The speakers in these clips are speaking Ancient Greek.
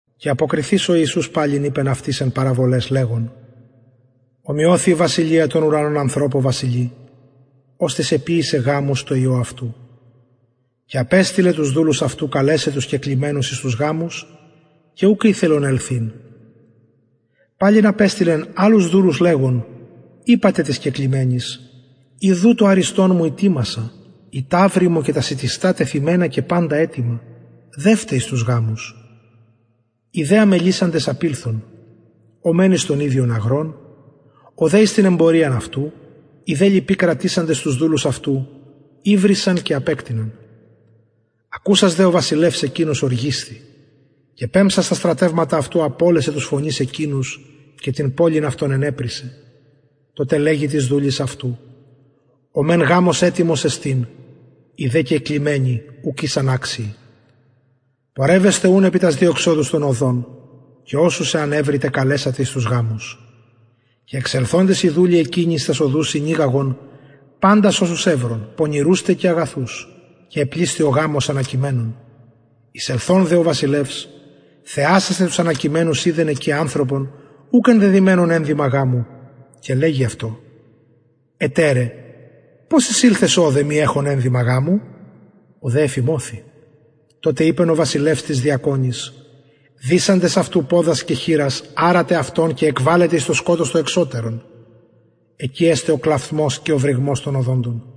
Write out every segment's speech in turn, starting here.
και αποκριθεις ο ιησους παλιν ειπεν αυτοις εν παραβολαις λεγων ωμοιωθη η βασιλεια των ουρανων ανθρωπω βασιλει οστις εποιησεν γαμους τω υιω αυτου και απεστειλεν τους δουλους αυτου καλεσαι τους κεκλημενους εις τους γαμους και ουκ ηθελον ελθειν παλιν απεστειλεν αλλους δουλους λεγων ειπατε τοις κεκλημενοις ιδου το αριστον μου ητοιμασα οι ταυροι μου και τα σιτιστα τεθυμενα και παντα ετοιμα δευτε εις τους γαμους οι δε αμελησαντες απηλθον ο μεν εις τον ιδιον αγρον ο δε εις την εμποριαν αυτου οι δε λοιποι κρατησαντες τους δουλους αυτου υβρισαν και απεκτειναν και ακουσας ο βασιλευς εκεινος ωργισθη και πεμψας τα στρατευματα αυτου απωλεσεν τους φονεις εκεινους και την πολιν αυτων ενεπρησεν τοτε λεγει τοις δουλοις αυτου ο μεν γαμος ετοιμος εστιν οι δε κεκλημενοι ουκ ησαν αξιοι πορευεσθε ουν επι τας διεξοδους των οδων και οσους αν ευρητε καλεσατε εις τους γαμους και εξελθοντες οι δουλοι εκεινοι εις τας οδους συνηγαγον παντας οσους ευρον πονηρους τε και αγαθους και επλησθη ο γαμος ανακειμενων εισελθων δε ο βασιλευς θεασασθαι τους ανακειμενους ειδεν εκει ανθρωπον ουκ ενδεδυμενον ενδυμα γαμου και λεγει αυτω εταιρε πως εισηλθες ωδε μη εχων ενδυμα γαμου ο δε εφιμωθη τοτε ειπεν ο βασιλευς τοις διακονοις δησαντες αυτου ποδας και χειρας αρατε αυτον και εκβαλετε εις το σκοτος το εξωτερον εκει εσται ο κλαυθμος και ο βρυγμος των οδοντων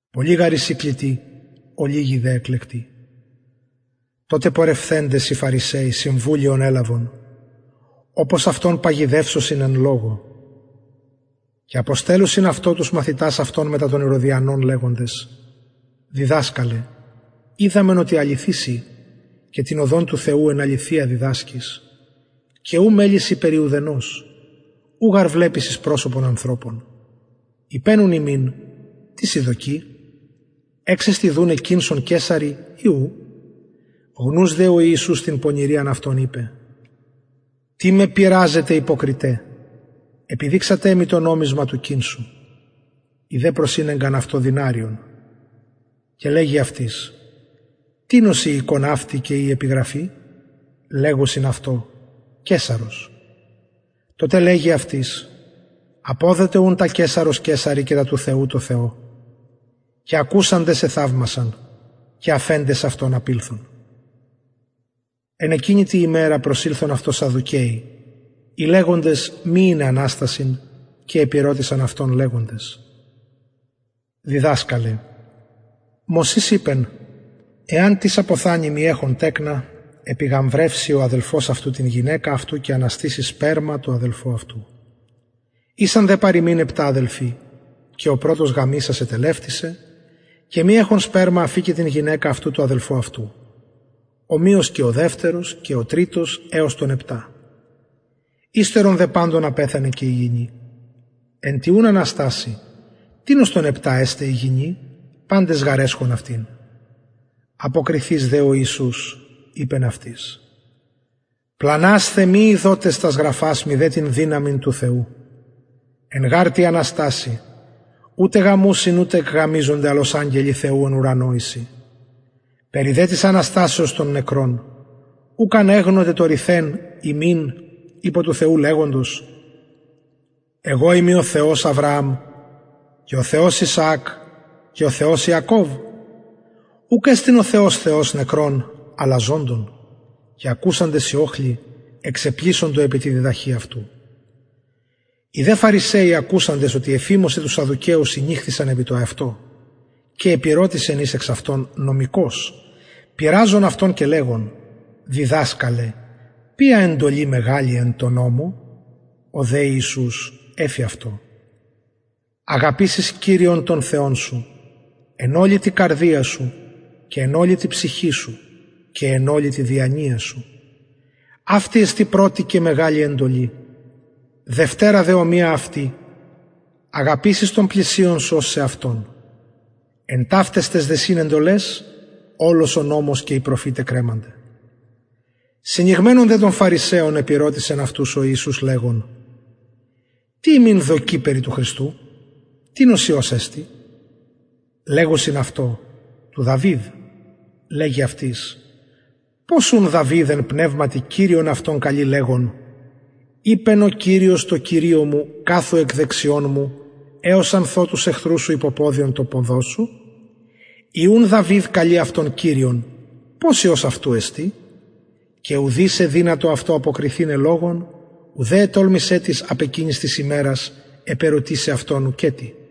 πολλοι γαρ εισιν κλητοι ολιγοι δε εκλεκτοι τοτε πορευθεντες οι φαρισαιοι συμβουλιον ελαβον οπως αυτον παγιδευσωσιν εν λογω και αποστελλουσιν αυτω τους μαθητας αυτων μετα των ηρωδιανων λεγοντες διδασκαλε οιδαμεν οτι αληθης ει και την οδον του θεου εν αληθεια διδασκεις και ου μελει σοι περι ουδενος ου γαρ βλεπεις εις προσωπον ανθρωπων ειπε ουν ημιν τι σοι δοκει εξεστιν δουναι κηνσον καισαρι η ου γνους δε ο ιησους την πονηριαν αυτων ειπεν τι με πειραζετε υποκριται επιδειξατε μοι το νομισμα του κηνσου οι δε προσηνεγκαν αυτω δηναριον και λεγει αυτοις τινος η εικων αυτη και η επιγραφη λεγουσιν αυτω καισαρος τοτε λεγει αυτοις αποδοτε ουν τα καισαρος καισαρι και τα του θεου τω θεω και ακουσαντες εθαυμασαν και αφεντες αυτον απηλθον εν εκεινη τη ημερα προσηλθον αυτω σαδδουκαιοι οι λεγοντες μη ειναι αναστασιν και επηρωτησαν αυτον λεγοντες διδασκαλε μωσης ειπεν εαν τις αποθανη μη εχων τεκνα επιγαμβρευσει ο αδελφος αυτου την γυναικα αυτου και αναστησει σπερμα τω αδελφω αυτου ησαν δε παρ ημιν επτα αδελφοι και ο πρωτος γαμησας ετελευτησεν και μη εχων σπερμα αφηκεν την γυναικα αυτου τω αδελφω αυτου ομοιως και ο δευτερος και ο τριτος εως των επτα υστερον δε παντων απεθανεν και η γυνη εν τη ουν αναστασει τινος των επτα εσται γυνη παντες γαρ εσχον αυτην αποκριθεις δε ο ιησους ειπεν αυτοις πλανασθε μη ειδοτες τας γραφας μηδε την δυναμιν του θεου εν γαρ τη αναστασει ουτε γαμουσιν ουτε εκγαμιζονται αλλ ως αγγελοι του θεου εν ουρανω εισιν περι δε της αναστασεως των νεκρων ουκ ανεγνωτε το ρηθεν υμιν υπο του θεου λεγοντος εγω ειμι ο θεος αβρααμ και ο θεος ισαακ και ο θεος ιακωβ ουκ εστιν ο θεος θεος νεκρων αλλα ζωντων και ακουσαντες οι οχλοι εξεπλησσοντο επι τη διδαχη αυτου οι δε φαρισαιοι ακουσαντες οτι εφιμωσεν τους σαδδουκαιους συνηχθησαν επι το αυτο και επηρωτησεν εις εξ αυτων νομικος πειραζων αυτον και λεγων διδασκαλε ποια εντολη μεγαλη εν τω νομω ο δε ιησους εφη αυτω αγαπησεις κυριον τον θεον σου εν ολη καρδια σου και εν ολη ψυχη σου και εν ολη τη διανοια σου αυτη εστιν πρωτη και μεγαλη εντολη δευτερα δε ομοια αυτη αγαπησεις τον πλησιον σου ως σεαυτον εν ταυταις ταις δυσιν εντολαις ολος ο νομος και οι προφηται κρεμανται συνηγμενων δε των φαρισαιων επηρωτησεν αυτους ο ιησους λεγων τι υμιν δοκει περι του χριστου τινος υιος εστιν λεγουσιν αυτω του δαυιδ λεγει αυτοις πως ουν δαυιδ εν πνευματι κυριον αυτον καλει λεγων ειπεν ο κυριος τω κυριω μου καθου εκ δεξιων μου εως αν θω τους εχθρους σου υποποδιον των ποδων σου ει ουν δαυιδ καλει αυτον κυριον πως υιος αυτου εστιν και ουδεις εδυνατο αυτω αποκριθηναι λογον ουδε ετολμησεν τις απ εκεινης της ημερας επερωτησαι αυτον ουκετι